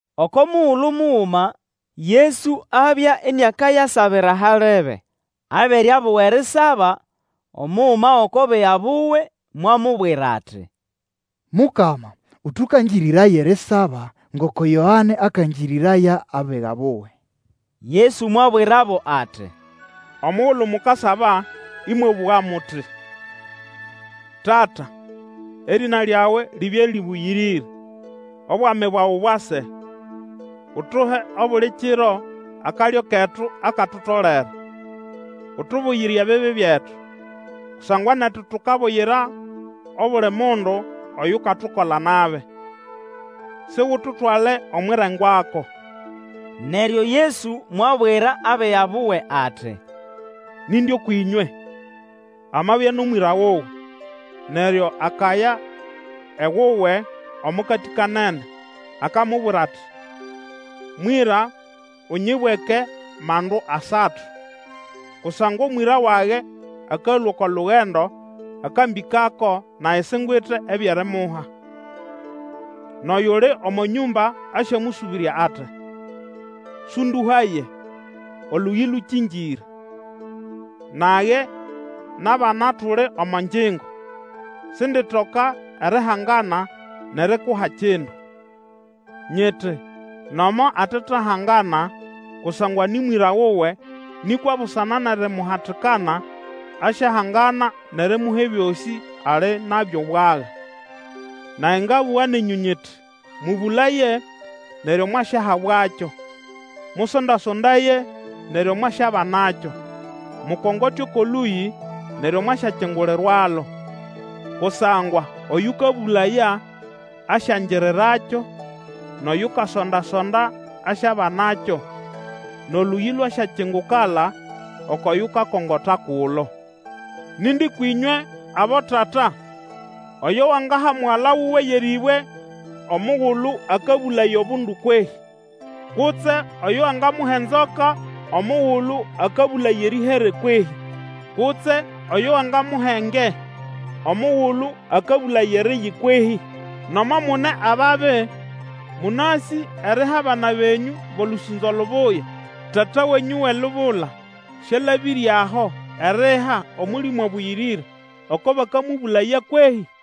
Oko mugulu muguma Yesu abya iniakayasabira halebe. Abere abuga erisaba, omuguma gʼoko biga buwe mwamubwira ati, Mukama, Ũtũkangĩrĩraye erisaba, ngoko Yoane akakangĩrĩraya abiga buwe. Yesu mwabwirabo ati, Omugulu mukasaba ĩmwabũga muti: Tata, Erĩna lyawe libye rĩbũyĩrĩre. Obwami bwawe bwase. Utuhe obuli kiro akalyo ketu akatutolere. Utubuyire ebibi byetu, Kusangwa netu tukabuyira obuli mundu oyukatukola nabi. Sigututwale omwʼirengwako. Neryo Yesu mwabwira abiga buwe ati, Nindi kwĩnywe amabya nʼomwĩra wuwe, neryo akaya ewuwe omo katĩkanene, akamubwira ati, Mwĩra unyibweke mandu asatu. Kusangwa omwĩra wage, akalũa oko lugendo akambĩkako, nage singwite ebyʼerimuha. Nʼoyuli omo nyũmba asyamũsũbĩrya ati, Sũndũhaye; Olũyĩ lũkĩngĩre, nage nʼabana tuli omo ngyingo; sinditoka erihangana nʼerikuha kindu. Nyiti nomo atetahangana kusangwa nĩ mwĩra wuwe, nĩkwa busana nʼerimuhatikana, asyahangana nʼerimuha ebyosĩ ali nabyo bwaga. Nage ngabũga nenyũ nyiti, Mũbũlaye, neryo mwasyahabwakyo; mũsonda-sondaye, neryo mwasyabanakyo; mukongote oko lũyĩ, neryo mwasyakingulirwalo. Kusangwa oyũkabũlaya, asyangirirakyo, nʼoyukasonda-sonda asyabanakyo; nʼolũyĩ lwasyakingukala oko yukakongota kulo. Nindi kwĩnywe abotata oyo wangaha mugala wuwe yʼerĩbwe omugulu akabũlaya obundu kwehĩ? Kutse oyo wangamuha enzoka omugulu akabũlaya erĩhere kwehĩ? Kutse oyo wangamuha enge, omugulu akabũlaya eriyi kwehĩ? Nomo mune ababi, mũnasĩ eriha abana benyũ bʼolũsũnzo lubuya. Tata wenyũ wʼelubula syalabĩre aho eriha Omũlĩmũ Abũyĩrĩre oko bakamũbũlaya kwehĩ?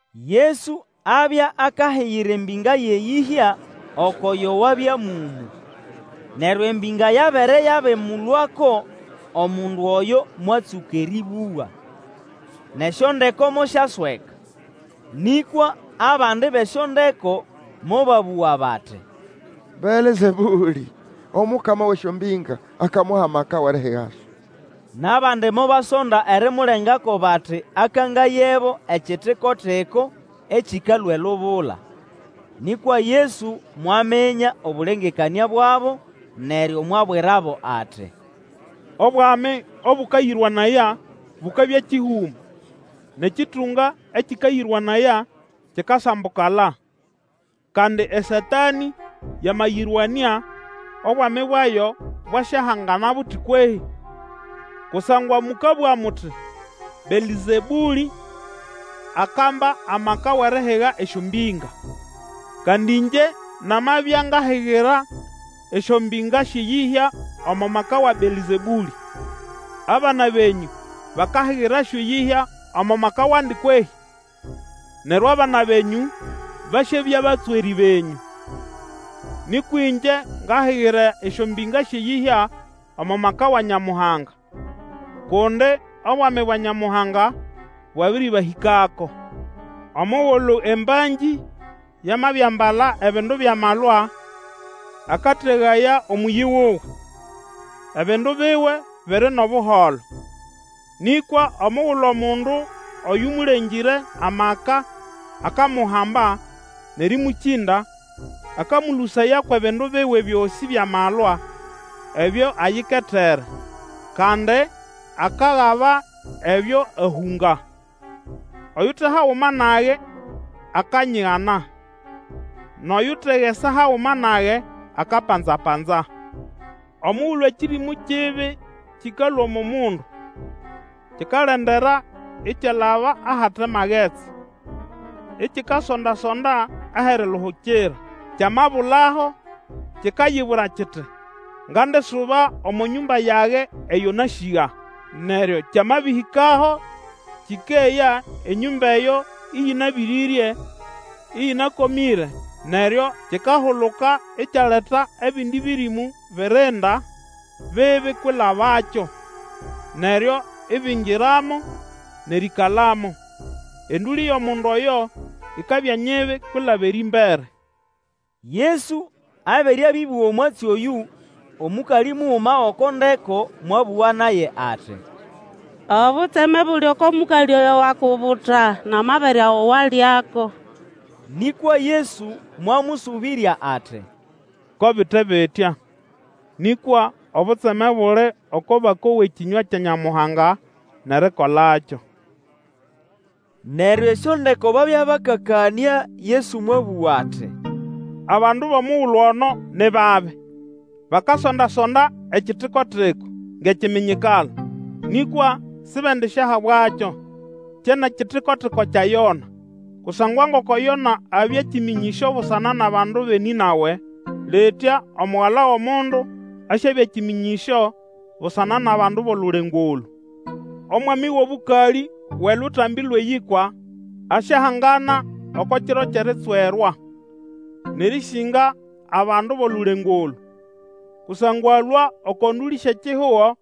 Yesu abya akahigira embĩnga yʼeyĩhya oko yo wabya mũmũ. Neryo embĩnga yabere yabĩmũlũako, omundu oyo mwatsũka erĩbũga. Nʼesyondeko mosyasweka. Nĩkwa abandi bʼesyondeko mobabũga bati, Belzebũlĩ, omukama wʼesyombĩnga akamuha maka wʼerihigasyo. Nʼabandi mobasonda erimulengako, bati akangayebo ekitiko-tiko ekĩkalũa elubula. Nĩkwa Yesu mwaminya obũlengekanĩa bwabo, neryo mwabwirabo ati, Obwami obũkayĩrwanaya bukabya kĩhũma, nʼekĩtũnga ekĩkayĩrwanaya kikasambukala. Kandi eSatanĩ yamayĩrwanĩa, obwami bwayo bwasyahangana buti kwehĩ? Kusangwa mũkabũga muti, Belzebũlĩ akamba amaka wʼerihiga esyombĩnga. Kandi ĩngye namabya ngahigira esyombĩnga syʼeyĩhya omo maka wa Belzebũlĩ, abana benyũ, bakahigirasyo eyĩhya omo maka wandi kwehĩ? Neryo abana benyũ basyabya batswerĩ benyũ. Nĩkwa ĩngye ngahigira esyombĩnga syʼeyĩhya omo maka wa Nyamuhanga, kundi obwami bwa Nyamuhanga bwabĩrĩbahĩkako. Omugulu embangĩ yamabiambala ebindu byʼamalwa, akategaya omũyĩ wuwe, ebindu biwe biri nʼobuholo. Nĩkwa omugulu omundu oyũmũlengĩre amaka akamuhamba nʼerĩmũkĩnda, akamũlũsaya kwʼebindu biwe byosĩ byʼamalwa, ebyo ayiketere, kandi akagaba ebyo ahũnga. Oyute haguma nage, akanyigana, nʼoyutegesa haguma nage akapanza-panza. Omugulu ekĩrĩmũ kibi kĩkalũa omo mundu, kikalendera ikyalaba ahate magetsi, ikikasonda-sonda ahʼeriluhukira; kyamabulaho, kikayibwira kiti, Ngandisuba omo nyũmba yage eyo nasĩga. Neryo kyamabĩhĩkaho kĩkeya enyũmba eyo ĩyĩnabĩrĩrye, ĩyĩnakomĩre. Neryo kikahuluka ikyaleta ebindi bĩrĩmũ birinda bibi kwilabakyo, neryo ibingiramo nʼerĩĩkalamo. Endũlĩ yʼomundu oyo ikabya nyibi kwilaba erĩmbere. Yesu abere abĩbũga omwatsi oyũ, omũkalĩ muguma gʼoko ndeko mwabũga naye ati, Obutseme buli oko mũkalĩ oyo wakubuta nʼamabere ago walyako! Nĩkwa Yesu mwamũsũbĩrya ati, Ko bite bitya, nĩkwa obutseme buli oko bakowa ekĩnywa kya Nyamuhanga nʼerikolakyo. Neryo esyondeko babya bakakama, Yesu mwabũga ati, Abandu bʼomugulu ono ni babi! Bakasonda-sonda ekitiko-tiko ngʼekiminyikalo. Nĩkwa sibendisyahabwakyo, kyenʼekitiko-tiko kya Yona. Kusangwa ngoko Yona abya kĩmĩnyĩsyo busana nʼabandu bʼeNĩnawe, litya Omugala wʼOmundu asyabya kĩmĩnyĩsyo busana nʼabandu bʼolulengo olũ. Omwami wʼobũkalĩ wʼeLutambi lwʼeYĩkwa asyahangana oko kiro kyʼeritswerwa, nʼerĩsĩnga abandu bʼolulengo olũ, kusangwa alũa oko ndũlĩ syʼekihugo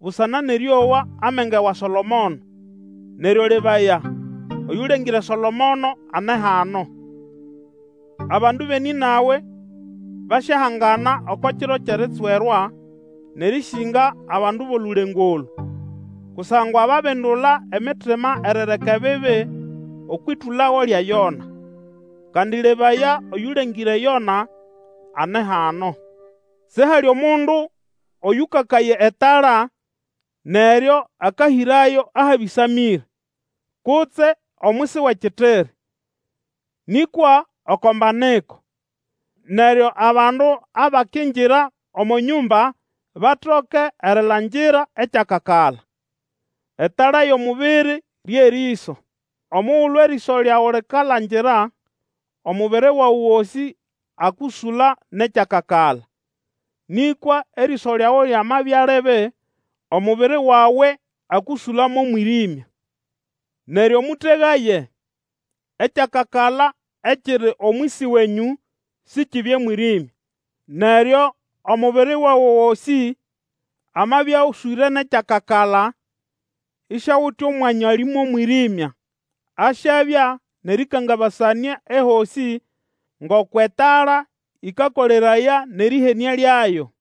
busana nʼerĩowa amenge wa Solomono; neryo lebaya, oyũlengĩre Solomono ane hano. Abandu bʼeNĩnawe basyahangana oko kiro kyʼeritswerwa nʼerĩsĩnga abandu bʼolulengo olũ, kusangwa babindula emitima erireka ebibi okwʼĩtũlago lya Yona. Kandi lebaya, oyũlengĩre Yona ane hano! Sihali mundu oyũkakaya etala neryo akahĩrayo ahabĩsamĩre, kutse omwisi wʼekitiri, nĩkwa oko mbaniko, neryo abandu abakingira omo nyũmba batoke erilangira ekyakakala. Etala yʼomubiri rye rĩso. Omugulu erĩso lyawe likalangira, omubiri wawe gosĩ akũsũla nʼekyakakala; nĩkwa erĩso lyawe lyamabya libi, omubiri wawe akũsũla mʼomwĩrĩmya. Neryo mũtegaye ekyakakala ekiri omwisi wenyũ sikibye mwĩrĩmya. Neryo omubiri wawe gosĩ amabya oswĩre nʼekyakakala, isiawite omwanya ali mʼomwĩrĩmya, asyabya nʼerĩkangabasanĩa ehosĩ, ngoko etala ĩkakoleraya nʼerĩhenĩa lyayo.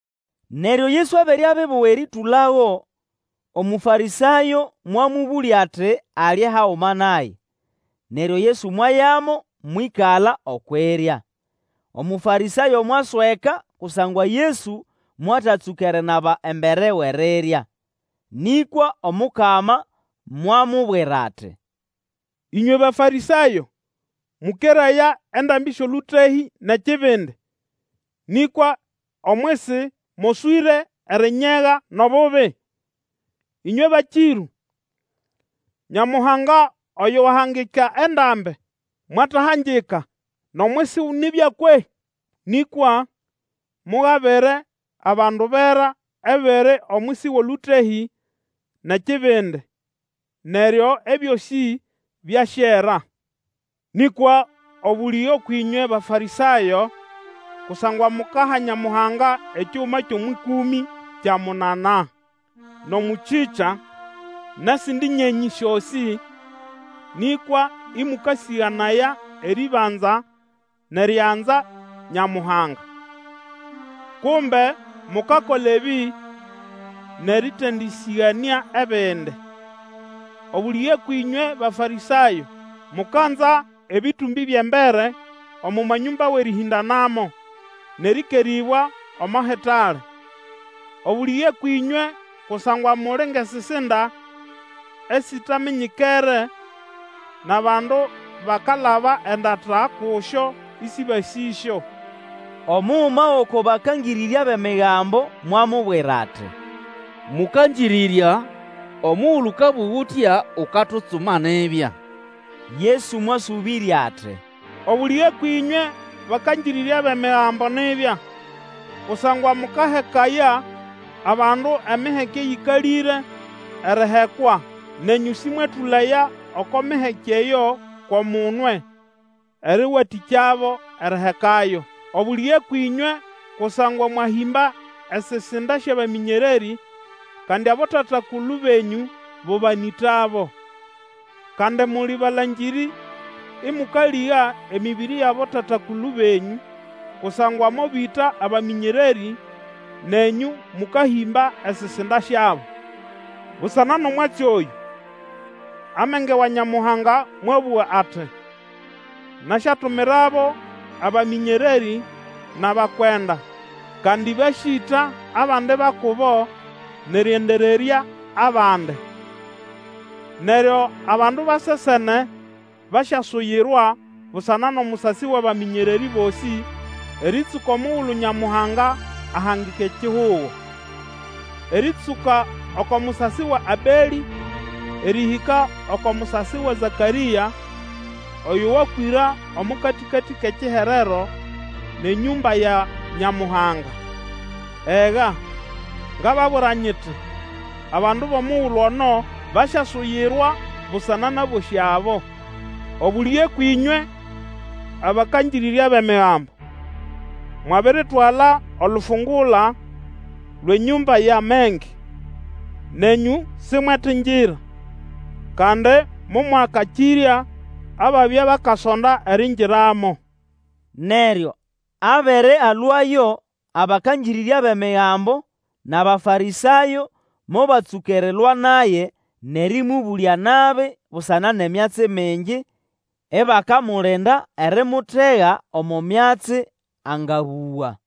Neryo Yesu abere abibuga erĩtũlago, Umũfarĩsayo mwamũbũlya ati alye haguma naye; neryo Yesu mwayamo mwĩkala okwʼirya. Omũfarĩsayo mwasweka kusangwa Yesu mwatatsũka erinaba embere wʼerirya. Nĩkwa Omukama mwamubwira ati, Ĩnywe Bafarĩsayo mũkeraya endambi syʼolũtehĩ nʼekibindi; nĩkwa omwisi moswĩre erinyega nʼobubi. Ĩnywe bakĩrũ! Nyamuhanga oyo wahangika endambi, mwatahangika nʼomwisi nibya kwehĩ? Nĩkwa mugabire abandu bera ebiri omwisi wʼolũtehĩ nʼekibindi, neryo ebyosĩ byasyera. Nĩkwa obũlĩge kwĩnywe Bafarĩsayo! Kusangwa mukaha Nyamuhanga ekiguma kyʼomwʼĩkũmĩ kya munanaa, nʼomũchĩcha, nʼesindi nyenyĩ syosĩ, nĩkwa ĩmũkasĩganaya erĩbanza nʼerianza Nyamuhanga. Kumbe mukakola ebĩ nʼerĩtendĩsĩganĩa ebindi. Obũlĩge kwĩnywe Bafarĩsayo! Mukanza ebĩtũmbĩ byʼembere omo manyũmba wʼerĩhĩndanamo, nʼerĩkerĩbwa omo hitale. Obũlĩge kwĩnywe, kusangwa muli ngʼesisinda esitaminyikere, nʼabandu bakalaba endata kusyo ĩsĩbasĩsyo. Omuguma gʼoko bakangĩrĩrya bʼEmigambo mwamubwira ati, Mũkangĩrĩrya, omugulu ũkabũga utya ukatutsuma nibya. Yesu mwasũbĩrya ati, Obũlĩge kwĩnywe bakangĩrĩrya bʼEmigambo nibya! Kusangwa mũkahekaya abandu emiheke eyĩkalĩre erihekwa, nenyũ sĩmwetũlaya oko miheke eyo kʼomunwe erĩwatĩkyabo erihekayo. Obũlĩge kwĩnywe! Kusangwa mwahĩmba esisinda syʼabamĩnyererĩ, kandi abotata-kulu benyũ bo banĩtabo. Kandi muli balangĩrĩ ĩmũkalĩga emĩbĩrĩ yʼabotata-kulu benyũ; kusangwa mobĩta abamĩnyererĩ, nenyũ mũkahĩmba esisinda syabo. Busana nʼomwatsi oyũ, Amenge wa Nyamuhanga mwabũga ati, Nasyatumirabo abamĩnyererĩ nʼabakwenda, kandi basyĩta abandi ba kubo nʼerĩendererya abandi. Neryo abandu ba sesene basyasuyirwa busana nʼomusasi wʼabamĩnyererĩ bosĩ erĩtsũka omugulu Nyamuhanga ahangika ekihugo, erĩtsũka oko musasi wa Abelĩ, erĩhĩka oko musasi wa Zakarĩa oyo wakwĩra omo katĩkatĩ kʼekiherero nʼenyũmba ya Nyamuhanga. Ega, ngababwira nyiti, abandu bʼomugulu ono basyasuyirwa busana nʼabosĩ abo! Obũlĩge kwĩnywe, abakangĩrĩrya bʼEmigambo! Mwabiritwala olufungula lwʼenyũmba yʼamenge; nenyũ simwetingira, kandi momwakakĩrya ababya bakasonda eriingiramo. Neryo abere alũayo, abakangĩrĩrya bʼEmigambo, nʼAbafarĩsayo mobatsũka erilwa naye nʼerĩmũbũlya nabi busana nʼemyatsi mingi, ibakamulinda erimutega omo myatsi angabũga.